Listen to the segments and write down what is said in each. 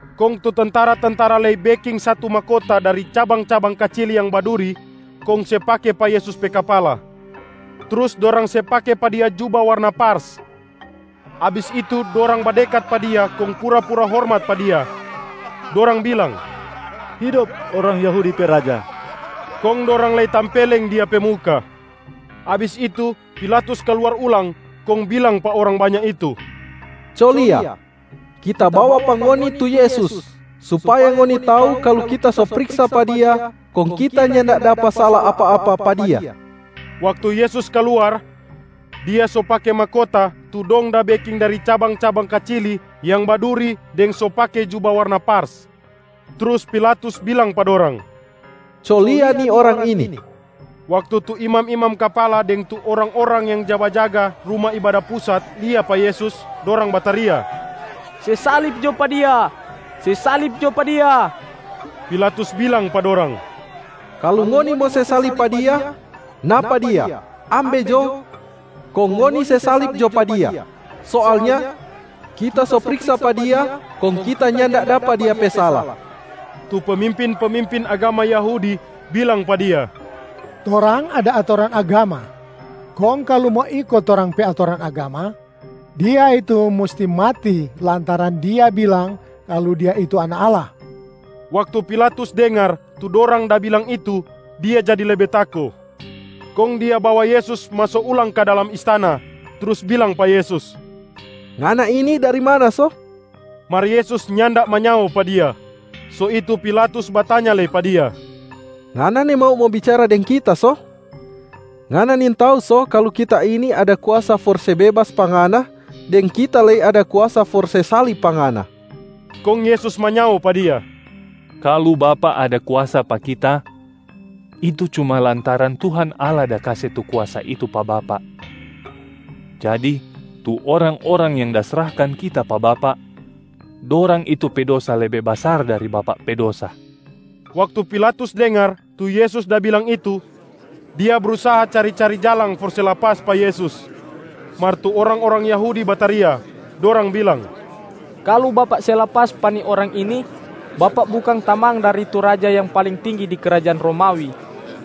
Kong tu tentara-tentara lei beking satu mahkota dari cabang-cabang kacili yang baduri kong se pake pa Yesus pe kapala. Trus dorang se pake pa Dia juba warna pars. Abis itu, dorang badekat pa Dia kong pura-pura hormat pa Dia, dorang bilang, “Hidop orang Yahudi pe raja!” Kong dorang lei tampeleng Dia pe muka. Abis itu, Pilatus kaluar ulang kong bilang pa orang banya itu, “Co lia, kita bawa pa ngoni tu Yesus, supaya ngoni tau kalu kita so priksa pa Dia kong kita nyanda dapa sala apa-apa pa Dia.” Waktu Yesus kaluar, Dia so pake mahkota tu dong da beking dari cabang-cabang kacili yang baduri deng so pake juba warna pars. Trus Pilatus bilang pa dorang, “Co lia ni Orang ini.” Waktu tu imam-imam kapala deng tu orang-orang yang ja bajaga Ruma Ibada Pusat lia pa Yesus, dorang bataria, “Se salib jo pa Dia, se salib jo pa Dia!” Pilatus bilang pa dorang, “Kalu ngoni mo se salib pa Dia, napa Dia ambe jo kong ngoni se salib jo pa Dia. Soalnya kita so priksa pa Dia, kong kita nyanda dapa Dia pe sala.” Tu pemimpin-pemimpin agama Yahudi bilang pa dia, “Torang ada atoran agama. Kong kalu mo iko torang pe atoran agama, Dia itu musti mati lantaran Dia bilang kalu Dia itu Anak Allah.” Waktu Pilatus dengar tu dorang da bilang itu, dia jadi lebe tako. Kong dia bawa Yesus maso ulang ka dalam istana, trus bilang pa Yesus, “Ngana ini dari mana so?” Mar Yesus nyanda manyao pa dia. So itu Pilatus batanya lei pa Dia, “Ngana nimau mo bicara deng kita so? Ngana nintau so kalu kita ini ada kuasa for se bebas pa Ngana, deng kita lei ada kuasa for se salib pa Ngana?” Kong Yesus manyao pa dia, “Kalu bapak ada kuasa pa Kita, itu cuma lantaran Tuhan Allah da kase tu kuasa itu pa bapak. Jadi, tu orang-orang yang da srahkan Kita pa bapak, dorang itu pe dosa lebe basar dari bapak pe dosa.” Waktu Pilatus dengar tu Yesus da bilang itu, dia brusaha cari-cari jalang for se lapas pa Yesus. Mar tu orang-orang Yahudi bataria, dorang bilang, “Kalu bapak se lapas pa ni Orang ini, bapak bukang tamang dari tu raja yang paling tinggi di krajaan Romawi.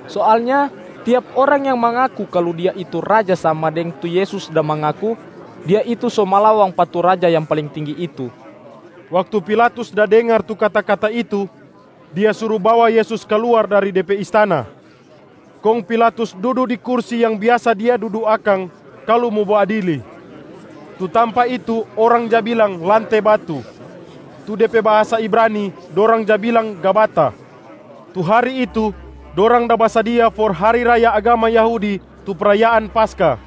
Soalnya tiap orang yang mangaku kalu dia itu raja sama deng tu Yesus da mangaku, dia itu so malawang pa tu raja yang paling tinggi itu.” Waktu Pilatus da dengar tu kata-kata itu, dia suru bawa Yesus kaluar dari de pe istana. Kong Pilatus dudu di kursi yang biasa dia dudu akang kalu mo baadili, tu tampa itu orang ja bilang Lante Batu. Tu de pe bahasa Ibrani, dorang ja bilang Gabata. Tu hari itu, dorang da basadia for hari raya agama Yahudi tu prayaan Paskah,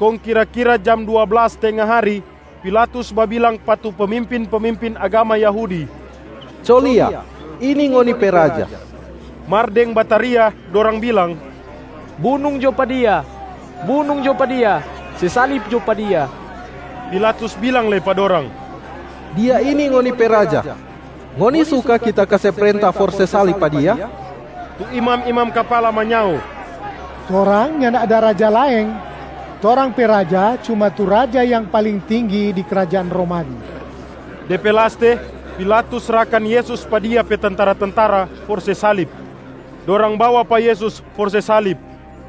kong kira-kira jam dua blas tenga hari, Pilatus babilang pa tu pemimpin-pemimpin agama Yahudi, “Co lia, ini ngoni pe raja!” Mar deng bataria dorang bilang, “Bunung jo pa Dia! Bunung jo pa Dia! Se salib jo pa Dia!” Pilatus bilang lei pa dorang, “Dia ini ngoni pe raja. Ngoni suka kita kase prenta for se salib pa Dia?” Tu imam-imam kapala manyao, “Torang nyanda ada raja laeng, torang pe raja cuma tu raja yang paling tinggi di krajaan Romawi.” De pe laste, Pilatus srahkan Yesus pa dia pe tentara-tentara for se salib. Tentara-tentara se salib pa Yesus Dorang bawa pa Yesus for se salib.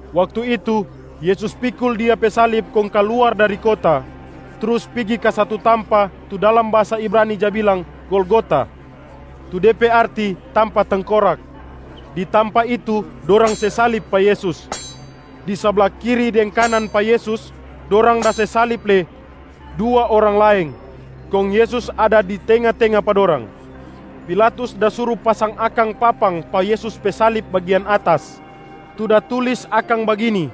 Waktu itu, Yesus pikul Dia pe salib kong kaluar dari kota trus pigi ka satu tampa tu dalam bahasa Ibrani ja bilang Golgota, tu de pe arti Tampa Tengkorak. Di tampa itu dorang se salib pa Yesus. Di sabla kiri deng kanan pa Yesus dorang da se salib lei dua orang laeng, kong Yesus ada di tenga-tenga pa dorang. Pilatus da suru pasang akang papang pa Yesus pe salib bagian atas, tu da tulis akang bagini,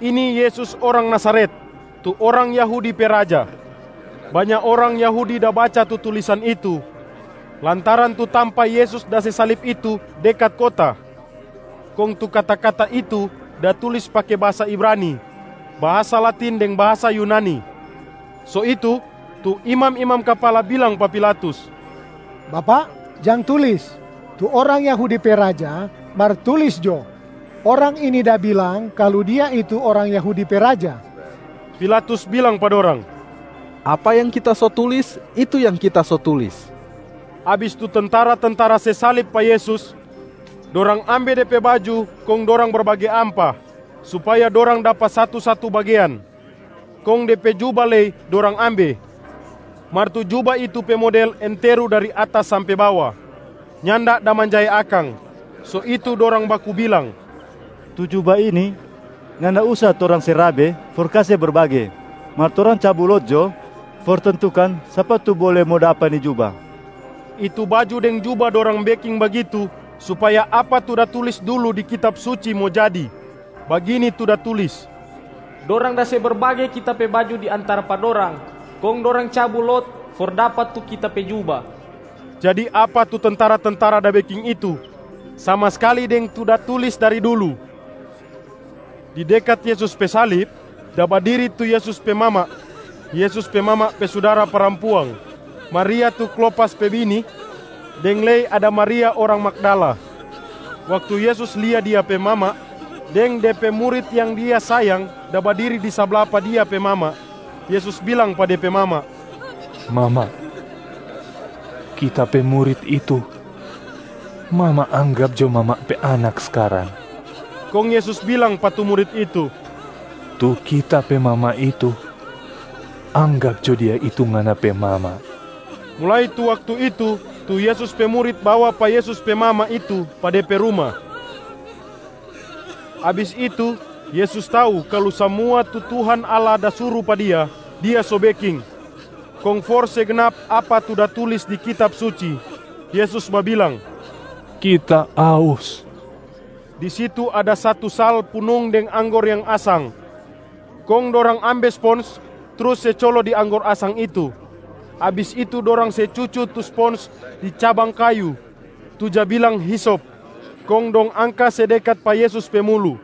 ‘Ini Yesus orang Nazaret, tu orang Yahudi pe Raja.’ Banya orang Yahudi da baca tu tulisan itu lantaran tu tampa Yesus da se salib itu dekat kota, kong tu kata-kata itu da tulis pake bahasa Ibrani, bahasa Latin deng bahasa Yunani. So itu, tu imam-imam kapala bilang pa Pilatus, “Bapak, jang tulis, ‘Tu orang Yahudi pe Raja’, mar tulis jo, ‘Orang ini da bilang kalu Dia itu orang Yahudi pe Raja.’” Pilatus bilang pa dorang, “Apa yang kita so tulis, itu yang kita so tulis.” Abis tu tentara-tentara se salib pa Yesus, dorang ambe De pe baju kong dorang berbage ampa supaya dorang dapa satu-satu bagean. Kong De pe juba lei dorang ambe. Mar tu juba itu pe model enteru dari atas sampe bawa, nyanda da manjae akang. So itu dorang baku bilang, “Tu juba ini nyanda usa torang se rabe for kase berbage, mar torang cabu lot jo for tentukan sapa tu bole mo dapa ni juba.” Itu baju deng juba dorang beking bagitu, supaya apa tu da tulis dulu di Kitab Suci mo jadi. Bagini tu da tulis, “Dorang da se berbage Kita pe baju di antara pa dorang, kong dorang cabu lot for dapa tu Kita pe juba.” Jadi apa tu tentara-tentara da beking itu, sama skali deng tu da tulis dari dulu. Di dekat Yesus pe salib, da badiri tu Yesus pe mama, Yesus pe mama pe sudara parampuang, Maria tu Klopas pe bini deng lei ada Maria orang Magdala. Waktu Yesus lia Dia pe mama deng De pe murit yang Dia sayang da badiri di sabla pa Dia pe mama, Yesus bilang pa De pe mama, “Mama, Kita pe murit itu, mama anggap jo mama pe anak skarang.” Kong Yesus bilang pa tu murit itu, “Tu Kita pe mama itu, anggap jo dia itu ngana pe mama!” Mulai tu waktu itu, tu Yesus pe murit bawa pa Yesus pe mama itu pa de pe ruma. Abis itu, Yesus tau kalu samua tu Tuhan Allah da suru pa Dia, Dia so beking. Kong for se gnap apa tu da tulis di Kitab Suci, Yesus babilang, “Kita aus.” Di situ ada satu sal punung deng anggor yang asang, kong dorang ambe spons trus se colo di anggor asang itu. Abis itu dorang se cucu tu spons di cabang kayu tu ja bilang hisop, kong dong angka se dekat pa Yesus pe mulu.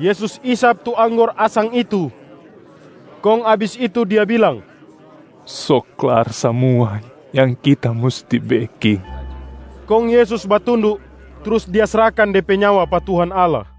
Yesus isap tu anggor asang itu, kong abis itu Dia bilang, “So klar samua yang Kita musti beking.” Kong Yesus batundu trus Dia srahkan De pe nyawa pa Tuhan Allah.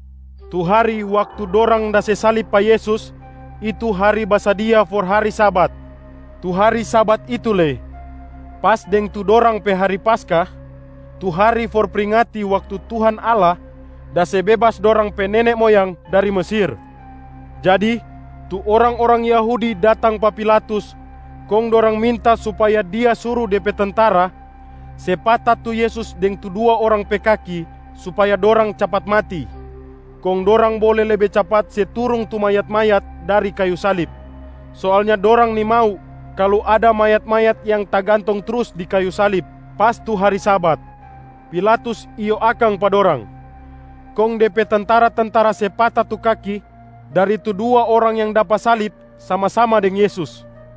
Tu hari waktu dorang da se salib pa Yesus, itu hari basadia for hari Sabat. Tu hari Sabat itu lei pas deng tu dorang pe hari Paskah tu hari for pringati waktu Tuhan Allah da se bebas dorang pe nene moyang dari Mesir. Jadi, tu orang-orang Yahudi datang pa Pilatus kong dorang minta supaya dia suru de pe tentara se pata tu Yesus deng tu dua orang pe kaki supaya dorang capat mati, kong dorang bole lebe capat se turung tu mayat-mayat dari kayu salib. Soalnya dorang nimau kalu ada mayat-mayat yang tagantong trus di kayu salib pas tu hari Sabat. Pilatus iyo akang pa dorang, kong de pe tentara-tentara se pata tu kaki dari tu dua orang yang dapa salib sama-sama deng Yesus.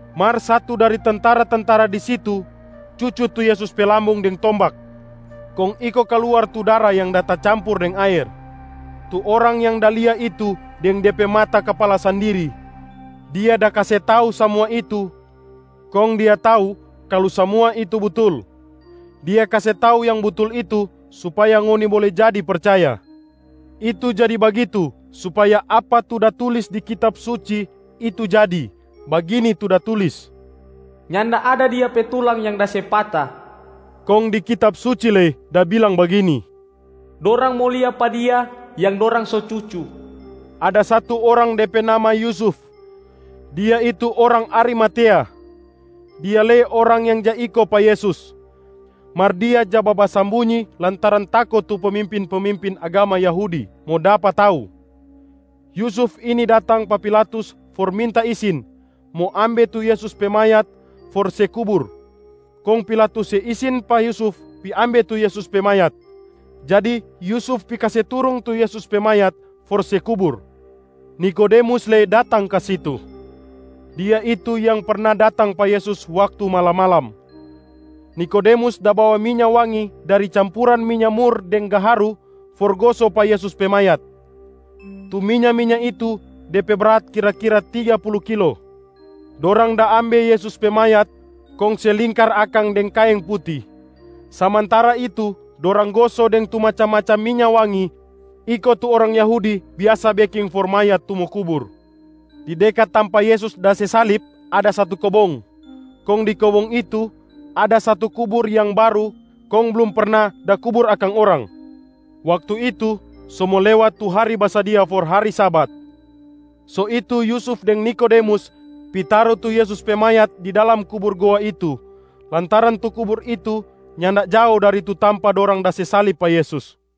Mar satu dari tentara-tentara di situ cucu tu Yesus pe lambung deng tombak, kong iko kaluar tu dara yang da tacampur deng aer. Tu orang yang da lia itu deng de pe mata kapala sandiri, dia da kase tau samua itu kong dia tau kalu samua itu butul. Dia kase tau yang butul itu supaya ngoni bole jadi percaya. Itu jadi bagitu, supaya apa tu da tulis di Kitab Suci itu jadi. Bagini tu da tulis, “Nyanda ada Dia pe tulang yang da se pata.” Kong di Kitab suci lei da bilang bagini, “Dorang mo lia pa Dia yang dorang so cucu.” Ada satu orang de pe nama Yusuf, dia itu orang Arimatea. Dia lei orang yang ja iko pa Yesus, mar dia ja babasambunyi lantaran tako tu pemimpin-pemimpin agama Yahudi mo dapa tau. Yusuf ini datang pa Pilatus for minta isin mo ambe tu Yesus pe mayat for se kubur. Kong Pilatus se isin pa Yusuf pi ambe tu Yesus pe mayat. Jadi Yusuf pi kase turung tu Yesus pe mayat for se kubur. Nikodemus lei datang ka situ. Dia itu yang perna datang pa Yesus waktu malam-malam. Nikodemus da bawa minya wangi dari campuran minya mur deng gaharu for goso pa Yesus pe mayat. Tu minya-minya itu de pe brat kira-kira tiga pulu kilo. Dorang da ambe Yesus pe mayat kong se lingkar akang deng kaeng puti, samantara itu dorang goso deng tu macam-macam minya wangi iko tu orang Yahudi biasa beking for mayat tu mo kubur. Di dekat tampa Yesus da se salib ada satu kobong. Kong di kobong itu, ada satu kubur yang baru kong blum perna da kubur akang orang. Waktu itu so mo lewat tu hari basadia for hari Sabat, so itu Yusuf deng Nikodemus pi taru tu Yesus pe mayat di dalam kubur goa itu lantaran tu kubur itu nyanda jao dari tu tampa dorang da se salib pa Yesus.a